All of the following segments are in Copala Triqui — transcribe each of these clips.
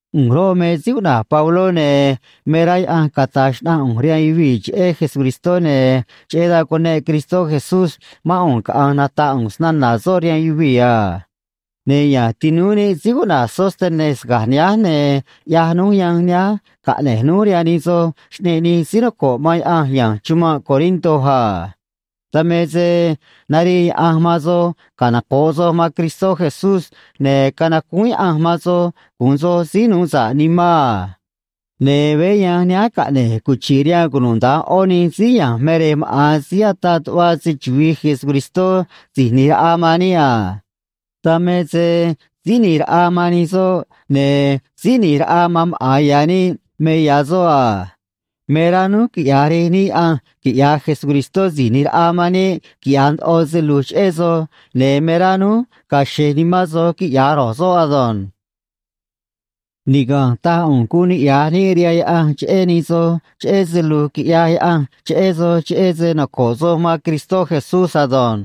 ꞌU̱nj roꞌ, me síí cuꞌna̱j Pabló, ne̱ me rá Yaꞌanj cata̱j xnaꞌanj ꞌu̱nj rihaan yuvii̱ cheꞌé Jesucristó, ne̱ cheꞌé dan cuneꞌ Cristó Jesús mán ꞌu̱nj caꞌa̱nj nata̱ꞌ ꞌu̱nj snana̱ soꞌ rihaan yuvii̱ a. Ne̱ ya̱nj tinúú níꞌ síí cuꞌna̱j Sóstenes ga̱j nihánj, ne̱ ꞌyaj núj yanj nihánj caꞌne̱j núj rihaan nij soj xꞌneꞌ nij síí noco̱ꞌ man Yaꞌanj ya̱nj chumanꞌ Corinto a. Dan me se narii Yaꞌanj man soj canoco̱ꞌ soj man Cristó Jesús, ne̱ canacúún Yaꞌanj man soj gu̱un soj síí nuu sa̱ꞌ nimán a. Ne̱ veé yanj nihánj caꞌne̱j cuchi̱ꞌ rihaan cunuda̱nj ꞌó nij síí ya̱nj me rej maꞌa̱n síí ataꞌ tuꞌva̱ se‑chuvi̱i Jesucristó Si̱j ꞌNi̱j Raꞌa man níꞌ a. Dan me se Síí ꞌNi̱j Raꞌa man nij soꞌ ne̱ Síí ꞌNi̱j Raꞌa man maꞌa̱n ya̱ níꞌ me ya̱ soꞌ a. Me rá núj quiꞌya̱j Rej níꞌ Yaꞌanj quiꞌya̱j Jesucristó Si̱j ꞌNi̱j Raꞌa man níꞌ quiꞌya̱j ndoꞌo se lu̱j cheꞌé soj, ne̱ me rá núj ga̱a̱ xe̱j nimán soj, quiꞌya̱j ro̱j soꞌ ado̱nj. Niga̱nj taj ꞌu̱nj guun niꞌya̱j níꞌ rihaan Yaꞌanj cheꞌé nij soj cheꞌé se lu̱j quiꞌyaj Yaꞌanj cheꞌé soj cheꞌé se noco̱ꞌ soj man Cristó Jesús ado̱nj.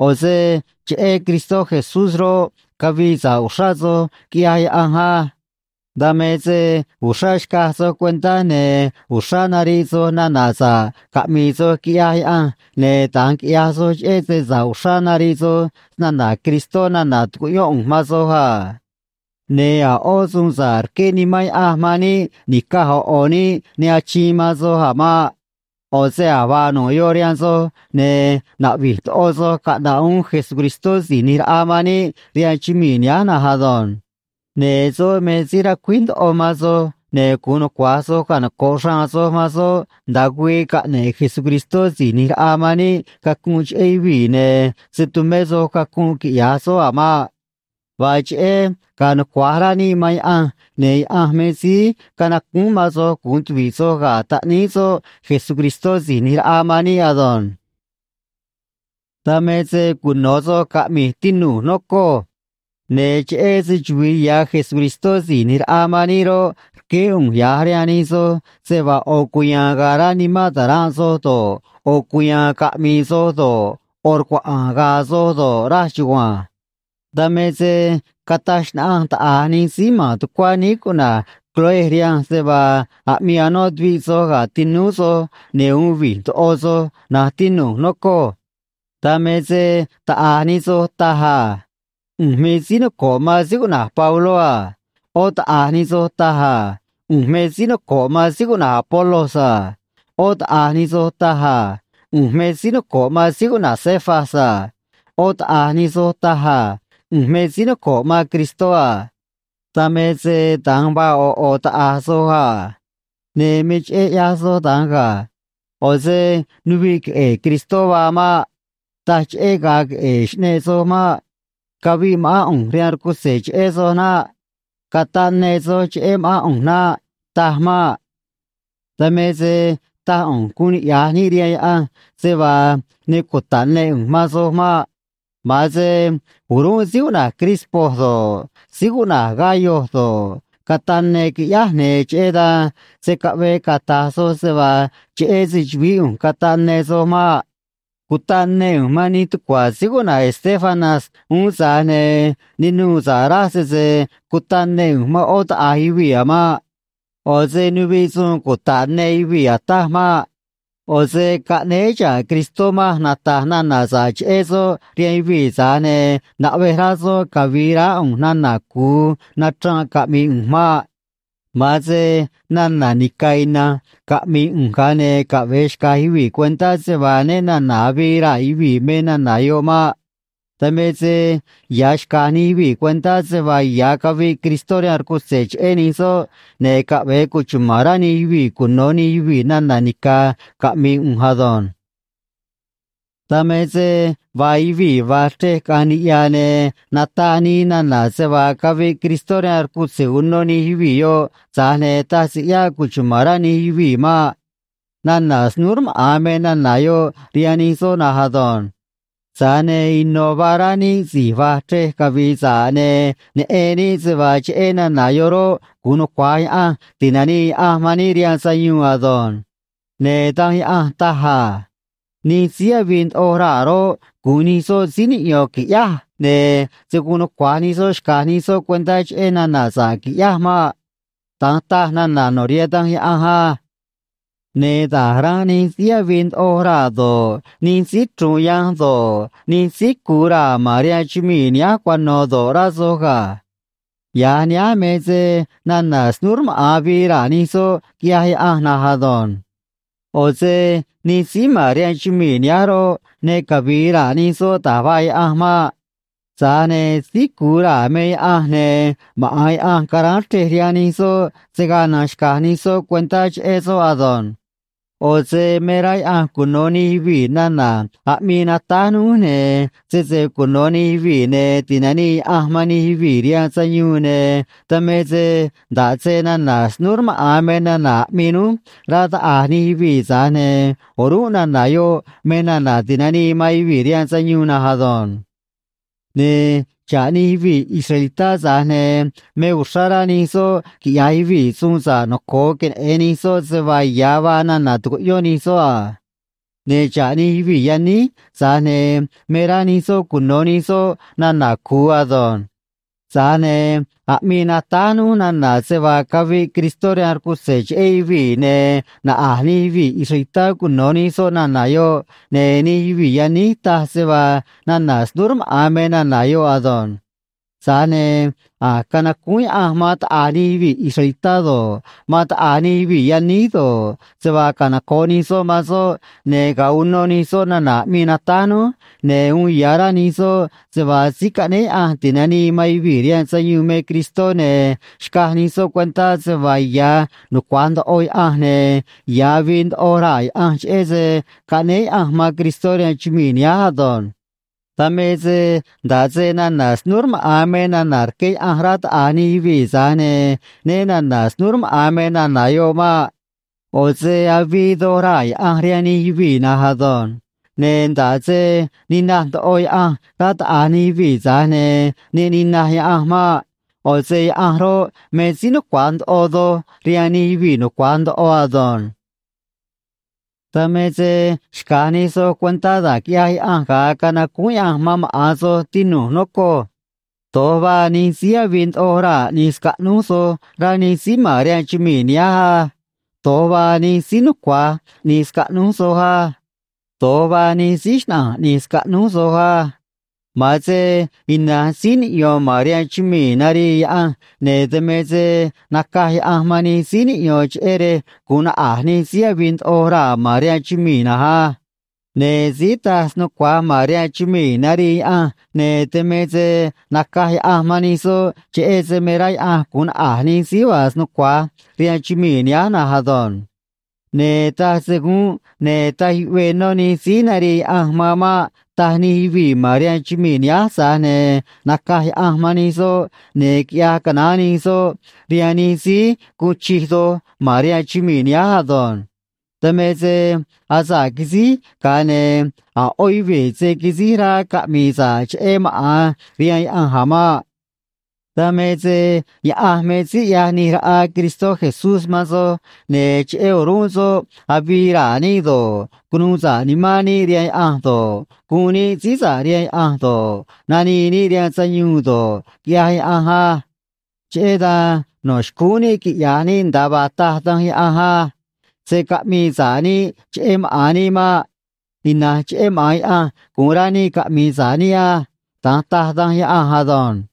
ꞌO̱ se cheꞌé Cristó Jesús roꞌ, cavii sa̱ꞌ uxrá soj, quiꞌyaj Yaꞌanj á. Dan me se uxrá xcaj soj cuentá, ne̱ uxrá nariꞌ soj nana̱ sa̱ꞌ caꞌmi̱i̱ soj, quiꞌyaj Yaꞌanj, ne̱ da̱nj quiꞌyaj soj cheꞌé se sa̱ꞌ uxrá nariꞌ soj snana̱ Cristó nana̱ tucuꞌyón ꞌu̱nj man soj a. Ne̱ a̱ ꞌó suun sa̱ꞌ rqué Nimán Yaꞌanj man níꞌ ni̱caj ꞌo̱ ꞌo̱ níꞌ ne achiin man soj a̱ maꞌ. ꞌO̱ se a̱j vaa nu̱ꞌ yoꞌ rihaan soj, ne̱ naꞌvi̱j ndoꞌo soj caꞌna̱ꞌ uún Jesucristó Si̱j ꞌNi̱j Raꞌa man níꞌ rihaan chumii̱ nihánj na̱nj ado̱nj. Ne̱ soꞌ me síí ra̱cuíj ndoꞌo man soj, ne̱ gu̱un nucua̱j soj canoco̱ꞌ xraan soj man soꞌ nda̱a güii caꞌne̱ꞌ Jesucristó Si̱j ꞌNi̱j Raꞌa man níꞌ cacunꞌ cheꞌé yuvii̱, ne̱ se̱ tumé soj cacunꞌ, quiꞌya̱j soꞌ a̱ maꞌ. Vaa cheꞌé ga̱a̱ nucua̱j rá níꞌ man Yaꞌanj, ne̱ Yaꞌanj me síí canacúún man soj gu̱un tuvi̱ꞌ soj ga̱ Taꞌníí soꞌ Jesucristó Si̱j ꞌNi̱j Raꞌa man níꞌ ado̱nj. Dan me se cuno̱ soj caꞌmi̱j, tinu̱j, nocoj. Ne̱ cheꞌé se‑chuvi̱i ya̱ Jesucristó Si̱j ꞌNi̱j Raꞌa man níꞌ roꞌ, rqueé ꞌu̱nj ya̱j rihaan nij soj se vaa ꞌo̱ cuya̱a̱n ga̱a̱ rá nimán ta̱ranꞌ soj do̱ꞌ, ꞌo̱ cuya̱a̱n caꞌmi̱i̱ soj do̱ꞌ, ꞌo̱ rcuaꞌa̱a̱n ga̱a̱ soj do̱ꞌ, raj chugua̱nj. Dan me se cataj xnaꞌanj taꞌa̱j nij síí ma̱n tucuá níí cuꞌna̱j Cloé rihanj se vaa aꞌmii anó tuviꞌ soj ga̱ tinúú soj ne̱ uun vi̱j ndoꞌo soj, na̱nj tinu̱j, nocoj. Dan me se taꞌa̱j nij soj taj a: “ꞌU̱nj me síí noco̱ꞌ man síí cuꞌna̱j Pabló a.” ꞌÓ taꞌa̱j nij soj taj a: “ꞌU̱nj me síí noco̱ꞌ man síí cuꞌna̱j Apolos a.” ꞌÓ taꞌa̱j nij soj taj a: “ꞌU̱nj me síí noco̱ꞌ man síí cuꞌna̱j Cefas a.” ꞌÓ taꞌa̱j nij soj taj a: “ꞌU̱nj me síí noco̱ꞌ man Cristó a.” Dan me se da̱nj vaa ꞌo̱ ꞌo̱ taꞌa̱j soj a. Ne̱ me cheꞌé ꞌyaj soj da̱nj ga̱. ꞌO̱ se nuviꞌ queꞌe̱e̱ Cristó vaa maꞌ. Taj cheꞌé ga̱a̱ queꞌe̱e̱ xꞌneꞌ soj maꞌ. Caviꞌ ma̱ꞌán ꞌu̱nj rihaan rcutze̱ cheꞌé soj naꞌ. Cataꞌ ne soj cheꞌé ma̱ꞌán ꞌu̱nj naꞌ. Taj maꞌ. Dan me se taj ꞌu̱nj guun niꞌya̱j níꞌ rihaan Yaꞌanj se vaa ne cuta̱ꞌ ne ꞌu̱nj man soj maꞌ. Ma̱an se o̱rúnꞌ síí cuꞌna̱j Crispo do̱ꞌ, síí cuꞌna̱j Gayo do̱ꞌ, cataꞌ ne quiꞌyáj, ne̱ cheꞌé dan se̱ caꞌvee cata̱j soj se vaa cheꞌé se‑chu̱vií ꞌu̱nj cataꞌ ne soj maꞌ. Cutaꞌ ne ꞌu̱nj man nij tucua̱ síí cuꞌna̱j Estéfanas uún, tza̱j ne̱ ne nuû sa̱ꞌ raj sese cutaꞌ ne ꞌu̱nj man ꞌó taꞌa̱j yuvii̱ a̱ maꞌ. ꞌO̱ se nuviꞌ suun cuta̱ꞌ ne yuvii̱ ataj maꞌ. ꞌO̱ se caꞌnéé xa̱ꞌ Cristó manj nata̱j nana̱ sa̱ꞌ cheꞌé soꞌ rihaan yuvii̱, tza̱j ne̱ naꞌvej rá soꞌ cavi̱i̱ raá ꞌu̱nj nana̱ cu̱u nachranꞌ caꞌmi̱i̱ ꞌu̱nj maꞌ. Ma̱an se nana̱ nica̱ ina̱nj caꞌmi̱i̱ ꞌu̱nj, ga̱a ne̱ caꞌve̱e xca̱j yuvii̱ cuentá se vaa né na̱na̱ avii raa̱ yuvii̱ me nana̱ yoꞌ maꞌ. Dan me se ya̱ xca̱j nij yuvii̱ cuentá se vaa ya̱ caviꞌ Cristó rihaan rcutze̱ cheꞌé nij soꞌ, ne̱ caꞌve̱e cuchuma̱n rá nij yuvii̱ cuno̱ nij yuvii̱ nana̱ nica̱ caꞌmi̱i̱ ꞌu̱nj ado̱nj. Dan me se vaa yuvii̱ va̱j chrej caꞌa̱nj niꞌya̱, ne̱ nataꞌ nii nana̱ se vaa caviꞌ Cristó rihaan rcutze̱ uno nij yuvii̱ yoꞌ, tza̱j ne̱ taj se ꞌyáꞌ cuchuma̱n rá nij yuvii̱ maꞌ. Nana̱ snúú rmaꞌa̱n me nana̱ yoꞌ rihaan nij soꞌ na̱nj ado̱nj. Tza̱j ne̱ ino̱ vaa rá níꞌ si̱j va̱j chrej cavi̱i̱ sa̱ꞌ, ne̱ neꞌen níꞌ se vaa cheꞌé nana̱ yoꞌ roꞌ, gu̱un nucua̱j Yaꞌanj ti̱nanii Yaꞌanj man níꞌ rihaan sayuun ado̱nj. Ne̱ Danj Yaꞌanj taj a: Nij síí avii ndoꞌo raa̱ roꞌ, gu̱un nij soꞌ síí niꞌyo̱n, qui̱ꞌyáj, ne̱ se̱ guun nucua̱j nij soꞌ xca̱j nij soꞌ cuentá cheꞌé nana̱ sa̱ꞌ, qui̱ꞌyáj maꞌ. Da̱nj taj nana̱ no̱ rihaan Danj Yaꞌanj á. Ne̱ da̱j ranꞌ nij síí avii ndoꞌo raa̱ do̱ꞌ, nij síí chru̱u̱n yanj do̱ꞌ, nij síí cu̱u raa̱ ma̱n rihaan chumii̱ nihánj cuano̱ do̱ꞌ, rá soj ga̱. Ya̱j nihánj me se nana̱ snúú rmaꞌa̱n avii raa̱ nij soꞌ, quiꞌyaj Yaꞌanj na̱nj ado̱nj. ꞌO̱ se nij síí ma̱n rihaan chumii̱ nihánj roꞌ, ne cavi̱i̱ raa̱ nij soꞌ da̱j vaa Yaꞌanj maꞌ. Tza̱j ne̱ síí cu̱u raa̱ me Yaꞌanj, ne̱ maꞌa̱n Yaꞌanj caráán chrej rihaan nij soꞌ se̱ gaa na̱nj xca̱j nij soꞌ cuentá cheꞌé soꞌ ado̱nj. ꞌO̱ se me rá Yaꞌanj cuno̱ nij yuvii̱ nana̱ aꞌmii natáj núj, ne̱ sese cuno̱ nij yuvii̱, ne̱ ti̱nanii Yaꞌanj man nij yuvii̱ rihaan sayuun, ne̱ dan me se nda̱ꞌ se nana̱ snúú rmaꞌa̱n me nana̱ aꞌmii núj, rá taꞌa̱j nij yuvii̱, tza̱j ne̱ o̱rúnꞌ nana̱ yoꞌ me nana̱ ti̱nanii man yuvii̱ rihaan sayuun na̱nj ado̱nj. Ne̱ xa̱ꞌ nij yuvii̱ israelitá, tza̱j ne̱ me uxrá rá nij soꞌ quiꞌya̱j yuvii̱ suun sa̱ꞌ noco̱o queneꞌe̱n nij soꞌ se vaa ya̱ vaa nana̱ tucuꞌyón nij soꞌ a. Ne̱ xa̱ꞌ nij yuvii̱ yaníj, tza̱j ne̱ me rá nij soꞌ cuno̱ nij soꞌ nana̱ cu̱u ado̱nj. Tza̱j ne̱ aꞌmii natáj núj nana̱ se vaa caviꞌ Cristó rihaan rcutze̱ cheꞌé yuvii̱, ne̱ naꞌa̱j nij yuvii̱ israelitá cuno̱ nij soꞌ nana̱ yoꞌ, ne̱ nij yuvii̱ yaníj taj se vaa nana̱ snúú rmaꞌa̱n me nana̱ yoꞌ ado̱nj. Tza̱j ne̱ a̱j canacúún Yaꞌanj man taꞌa̱j nij yuvii̱ israelitá do̱ꞌ, man taꞌa̱j nij yuvii̱ yaníj do̱ꞌ, se vaa canoco̱ꞌ nij soꞌ man soꞌ, ne̱ ga̱a uno nij soꞌ nana̱ aꞌmii natáj núj, ne̱ uun ya̱ rá nij soꞌ se vaa síí caꞌnéé Yaꞌanj ti̱nanii man yuvii̱ rihaan sayuun me Cristó, ne̱ xcaj nij soꞌ cuentá se vaa ya̱ nucua̱j ndoꞌo Yaꞌanj ne̱ ya̱ avii ndoꞌo raa̱ Yaꞌanj, cheꞌé se caꞌnéé Yaꞌanj man Cristó rihaan chumii̱ nihánj ado̱nj. Dan me se nda̱ꞌ se nana̱ snúú rmaꞌa̱n me nana̱ rqué Yaꞌanj, rá taꞌa̱j nij yuvii̱, tza̱j ne̱ né na̱na̱ snúú rmaꞌa̱n me nana̱ yoꞌ maꞌ. ꞌO̱ se avii doj raa̱ Yaꞌanj rihaan nij yuvii̱ na̱nj ado̱nj. Ne̱ nda̱ꞌ se ninaj ndoꞌo Yaꞌanj, rá taꞌa̱j nij yuvii̱, tza̱j ne̱ ne ninaj Yaꞌanj maꞌ. ꞌO̱ se Yaꞌanj roꞌ, me síí nucua̱j ndoꞌo doj rihaan nij yuvii̱ nucua̱j ndoꞌo ado̱nj. Dan me se xca̱j nij soj cuentá da̱j quiꞌyaj Yaꞌanj ga̱a canacúún Yaꞌanj man maꞌa̱n soj, tinu̱j, nocoj. Do̱j vaa nij síí avii ndoꞌo raa̱ ꞌni̱j scaꞌnúj soj, rá nij síí ma̱n rihaan chumii̱ nihánj á. Do̱j vaa nij síí nucua̱j ꞌni̱j scaꞌnúj soj á. Do̱j vaa nij síí xnaꞌa̱nj ꞌni̱j scaꞌnúj soj á. Ma̱an se ina̱nj síí niꞌyo̱n ma̱n rihaan chumii̱ narii Yaꞌanj, ne̱ dan me se nacaj Yaꞌanj man nij síí niꞌyo̱n, cheꞌé rej gu̱un naꞌa̱j nij síí avii ndoꞌo raa̱ ma̱n rihaan chumii̱ na̱nj á. Ne̱ síí taj snucua̱j ma̱n rihaan chumii̱ narii Yaꞌanj, ne̱ dan me se nacaj Yaꞌanj man nij soꞌ, cheꞌé se me rá Yaꞌanj gu̱un naꞌa̱j nij síí vaa snucua̱j rihaan chumii̱ nihánj na̱nj ado̱nj. Ne̱ taj se gúnꞌ ne̱ taj yuꞌvee nó nij síí narii Yaꞌanj man maꞌ, taj nij yuvii̱ ma̱n rihaan chumii̱ nihánj, tza̱j ne̱ nacaj Yaꞌanj man nij soꞌ, ne̱ quiꞌya̱j canaán nij soꞌ rihaan nij síí guun chij doj ma̱n rihaan chumii̱ nihánj ado̱nj. Dan me se asa̱ꞌ quisíj, ga̱a ne̱ a̱ ꞌó yuvii̱ se̱ quisíj rá caꞌmi̱i̱ sa̱ꞌ cheꞌé maꞌa̱n rihaan Yaꞌanj a̱ maꞌ. Dan me se Yaꞌanj me síí ꞌyaj ꞌni̱j raꞌa Cristó Jesús man soj, ne̱ cheꞌé o̱rúnꞌ soꞌ avii raa̱ níꞌ do̱ꞌ, cunuu sa̱ꞌ nimán níꞌ rihaan Yaꞌanj do̱ꞌ, guun níꞌ síí sa̱ꞌ rihaan Yaꞌanj do̱ꞌ, nanii níꞌ rihaan sayuun do̱ꞌ, quiꞌyaj Yaꞌanj á. Cheꞌé dan no̱ xcúún níꞌ quiꞌya̱j níꞌ nda̱a vaa taj Danj Yaꞌanj á. “Se̱ caꞌmii sa̱ꞌ níꞌ cheꞌé maꞌa̱n níꞌ maꞌ. Ina̱nj cheꞌé maꞌa̱n Yaꞌanj gu̱un rá níꞌ caꞌmi̱i̱ sa̱ꞌ níꞌ á.” Da̱nj taj Danj Yaꞌanj ado̱nj.